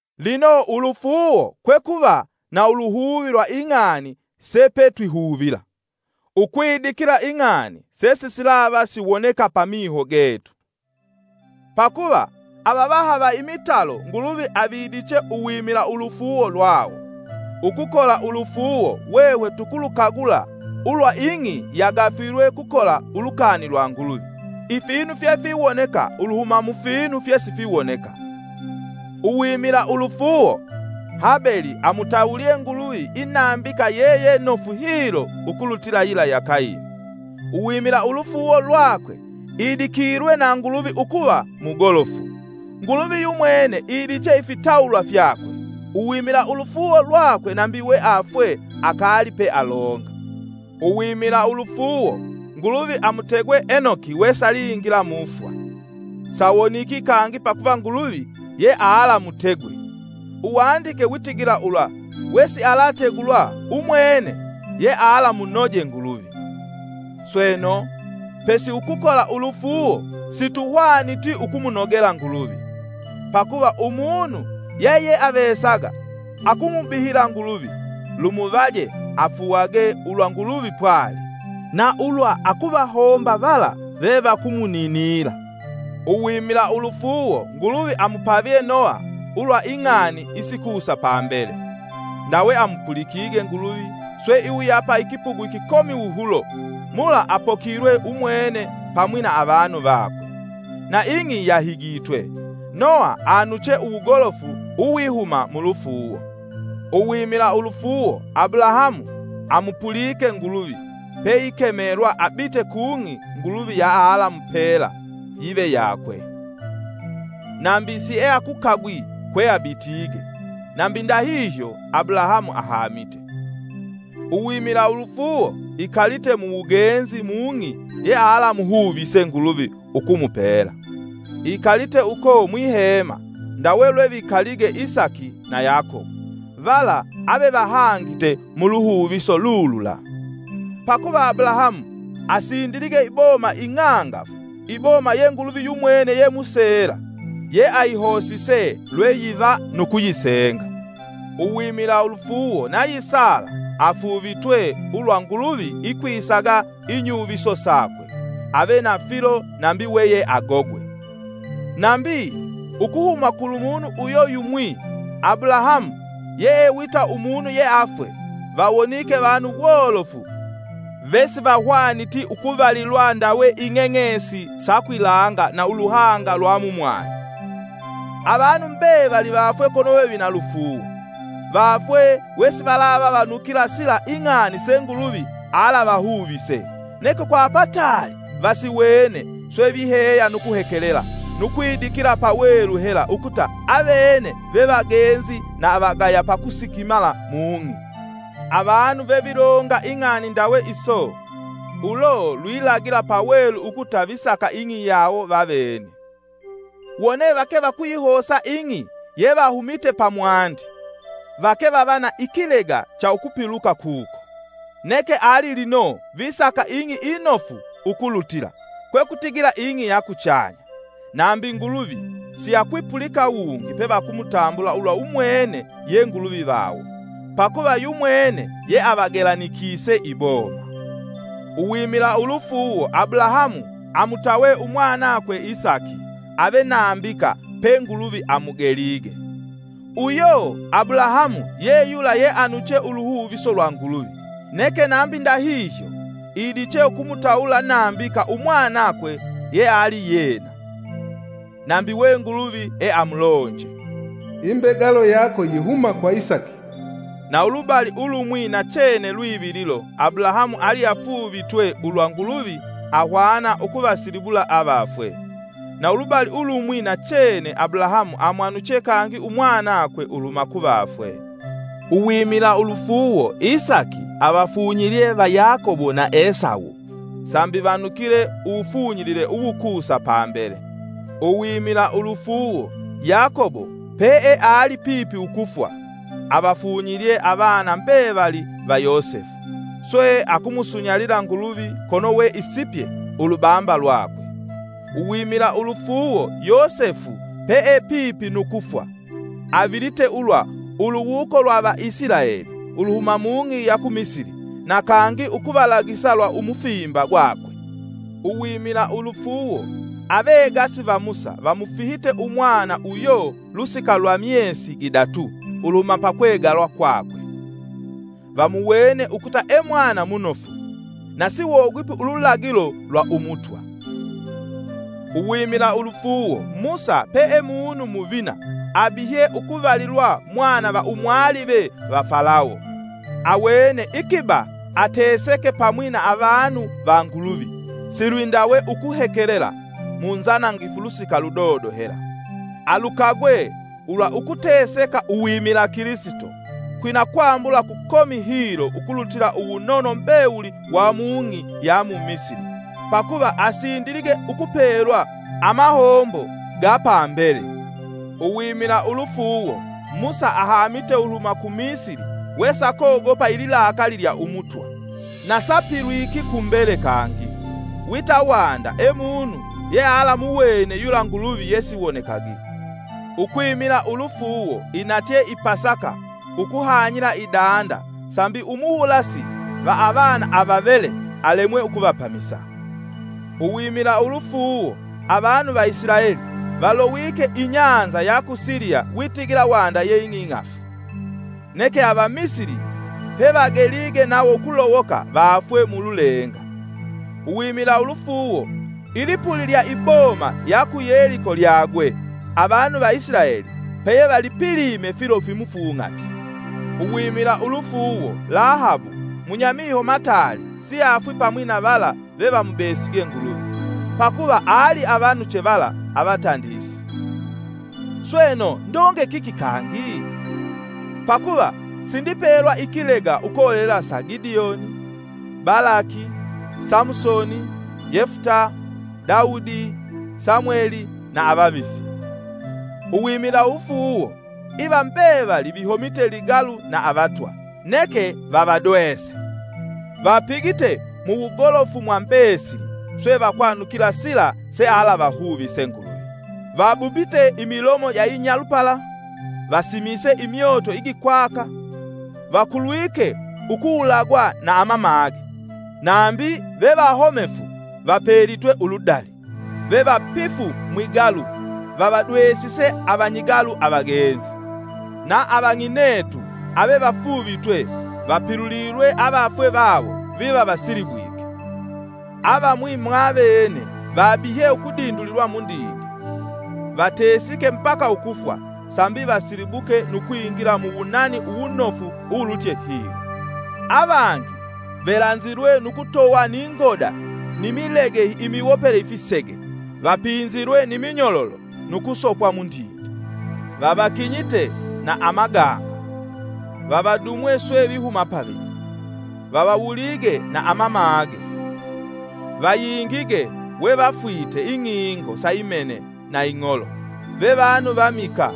Lino ulufuuwo kwekuva na uluhuvi lwa ing'ani sepetwihuvila, ukwidikila ing'ani sesisilava siwoneka pamiho getu. Pakuva avavaha va imitalo Nguluvi avidiche uwimila ulufuuwo lwawo. Ukukola ulufuuwo hwehwe tukulukagula ulwa ing'i yagafilwe kukola ulukani lwa Nguluvi, ifinu fyefiwoneka uluhuma mufinu fyesifiwoneka. Uwimila ulufuuwo Habeli amutawulye Nguluvi inambika yeye nofu hilo ukulutila yila ya Kayini. Uwimila ulufuuwo lwakwe idikilwe na Nguluvi ukuva mugolofu; Nguluvi yumwene idiche ifitawulwa fyakwe. Uwimila ulufuuwo lwakwe nambi we afwe, akali pealonga. Uwimila ulufuuwo Nguluvi amutegwe Enoki wesalingila mufwa. Sawoniki kangi pakuva Nguluvi yealamutegwe. Uwandike witigila ulwa wesialategulwa, umwene yealamunoje Nguluvi. Sweno, pesi ukukola ulufuuwo situhwaniti ukumunogela Nguluvi. Pakuva umunu yeyeavesaga akumubihila Nguluvi lumuvaje afuuwage ulwa Nguluvi pwali, na ulwa akuvahomba vala vevakumuninila. Uwimila ulufuuwo Nguluvi amupavye Noha ulwa ing'ani isikusa pambele. Ndawe amupulikige Nguluvi, swe iwuyapa ikipugu ikikomi wuhulo mula apokilwe umwene pamwi na avanu vakwe. Na ing'i yahigitwe, Noha anuche uwugolofu uwihuma mu lufuuwo. Uwimila ulufuuwo Abulahamu amupulike Nguluvi peikemelwa abite ku ng'i Nguluvi yealamupela yive yakwe. Nambi sieakukagwi kweabitige, nambi ndahihyo Abulahamu ahamite. Uwimila ulufuuwo ikalite mu wugenzi mung'i yealamuhuvise Nguluvi ukumupela. Ikalite uko mwihema ndawe lwevikalige Isaki na Yakobo, vala avevahangite muluhuviso lulula. Pakuva Abulahamu asindilige iboma ing'angafu, iboma ye Nguluvi yumwene ye museela yeaihosise lwe yiva nu kuyisenga. Uwimila ulufuuwo nayi Sala afuuvitwe ulwa Nguluvi ikwisaga inyuviso sakwe, ave na filo nambi we yeagogwe. Nambi, ukuhuma kulumunu uyo yumwi, Abulahamu, yee wita umunu yeafwe, vawonike vanu wolofu wesivahwaniti ukuvalilwa ndawe ing'eng'esi sa kwilanga na uluhanga lwa mu mwani. Avanu mbevali vafwe kono we vina lufuuwo. Vafwe wesivalava vanukila sila ing'ani se Nguluvi alavahuvise; neke kwa apataali vasiwene, swe viheya nu kuhekelela, nu kwidikila pawelu hela ukuta avene vevagenzi na avagaya pakusikimala mung'i. Avanu vevilonga ing'ani ndawe iso, ulo lwilagila pawelu ukuta visaka ing'i yawo vavene. Wone vake vakuyihosa ing'i yevahumite pamwandi, vake vava na ikilega cha ukupiluka kuko. Neke ali lino visaka ing'i inofu ukulutila, kwekutigila ing'i ya kuchanya. Nambi Nguluvi siakwipulika wungi pevakumutambula ulwa umwene ye Nguluvi vawo, pakuva yumwene yeavagelanikise iboma. Uwimila ulufuuwo Abulahamu amutawe umwanakwe Isaka ave nambika pe Nguluvi amugelige. Uyo Abulahamu ye yula yeanuche uluhuviso lwa Nguluvi, neke nambi ndahihyo, idiche ukumutawula nambika umwanakwe yealiyena. Nambi we Nguluvi eamulonje, “Imbegalo yako yihuma kwa Isaka.” Na ulubali ulumwi nachene lwivililo Abulahamu aliafuuvitwe ulwa Nguluvi ahwana ukuvasilibula avafwe, na ulubali ulumwi nachene Abulahamu amwanuche kangi umwanakwe uluhuma kuvafwe. Uwimila ulufuuwo Isaka avafunyilye va Yakobo na Esawu, sambi vanukile uwufunyilile uwukusa pambele. Uwimila ulufuuwo Yakobo pee ali pipi ukufwa, avafunyilye avana mbevali va Yosefu, swe akumusunyalila Nguluvi kono we isipye ulubamba lwakwe. Uwimila ulufuuwo Yosefu pe e pipi nu kufwa, avilite ulwa uluwuuko lwa va Isilaeli uluhuma mung'i ya ku Misili, na kangi ukuvalagisa lwa umufimba gwakwe. Uwimila ulufuuwo avegasi va Musa vamufihite umwana uyo lusika lwa myesi gidatu uluhuma pa kwegalwa kwakwe. Vamuwene ukuta emwana munofu, na siwogwipi ululagilo lwa Umutwa. Uwimila ulufuuwo Musa pe emunu muvina, abihye ukuvalilwa mwana va umwalive va Falawo. Awene ikiba ateseke pamwi na avanu va Nguluvi, silwindawe ukuhekelela mu nzanangifu lusika ludodo hela. Alukagwe ulwa ukuteseka uwimila Kilisito kwina kwambula kukomi hilo ukulutila uwunono mbewuli wa mung'i ya mu Misili, pakuva asindilige ukupelwa amahombo ga pambele. Uwimila ulufuuwo Musa ahamite uluhuma ku Misili wesakogopa ililakali lya Umutwa; na sapilwiki ku mbele kangi, wita wanda emunu yealamuwene yula Nguluvi yesiwonekagi. Ukwimila ulufuuwo inatye i Pasaka ukuhangila idanda sambi umuwulasi va avana avavele alemwe ukuvapamisa. Uwimila ulufuuwo avanu va Isilaeli valowike ibahali ya ku Siliya witigila wanda ye ing'i ng'afu; neke Avamisili pevagelige nawo ukulowoka vafwe mu lulenga. Uwimila ulufuuwo ilipuli lya iboma ya ku Yeliko lyagwe, avanu va Isilaeli peyevalipilime filo fimufung'ati. Uwimila ulufuuwo Lahabu munyamiho mataali siafwi pamwi na vala vevamubesige Nguluvi, pakuva ali avanuche vala avatandisi. Sweno, ndonge kiki kangi? Pakuva sindipelwa ikilega ukolelela sa Gidioni, Balaki, Samusoni, Yefuta, Daudi, Samweli na avavisi. Uwimila ulufuuwo iva mbevali vihomite ligalu na Avatwa, neke vavadwese. Vapigite mu uwugolofu mwa mbesili, swe vakwanukila sila sealahuvise Nguluvi. Vabubite imilomo ja inyalupala, vasimise imyoto igikwaka, vakulwike ukuwulagwa na amamage. Nambi, vevahomefu vapelitwe uludali. Vevapifu mwigalu vavadwesise avanyigalu avagenzi. Na avang'inetu avevafuuvitwe vapilulilwe avafwe vawo viva vasilibwike. Avamwi mwavene vabihye ukudindulilwa mundinde, vatesike mbaka ukufwa, sambi vasilibuke nu kwingila muwunani uwunofu uwulutye hilo. Avangi velanzilwe nu kutowa ni ngoda ni milegehi imiwopele ifisege vapinzilwe ni minyololo nu kusopwa mundinde. Vavakinyite na amaganga, vavadumwe swe vihuma pavili, vavawulige na amamage. Vayingige wevafwite ing'ingo sa imene na ing'olo, ve vanu vamikaa,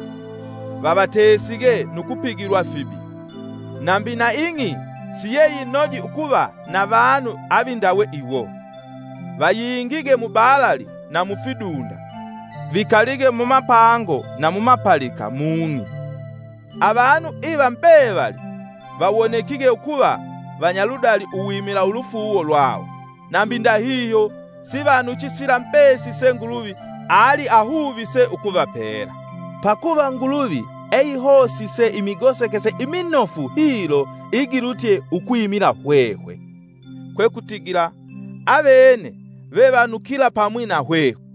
vavatesige nu kupigilwa fibi. Nambi na ing'i siye yinoji ukuva na vanu avindawe iwo. Vayingige mubalali na mufidunda; vikalige mumapango na mumapalika mung'i. Avanu iva mbevali vawonekige ukuva vanyaludali uwimila ulufuuwo lwawo. Nambi ndahihyo, sivanuchi sila mbesili se Nguluvi aliahuvise ukuvapela, pakuva Nguluvi eihosise imigosekese iminofu hilo igilutye ukwimila hwehwe, kwekutigila avene vevanukila pamwi na hwehwe.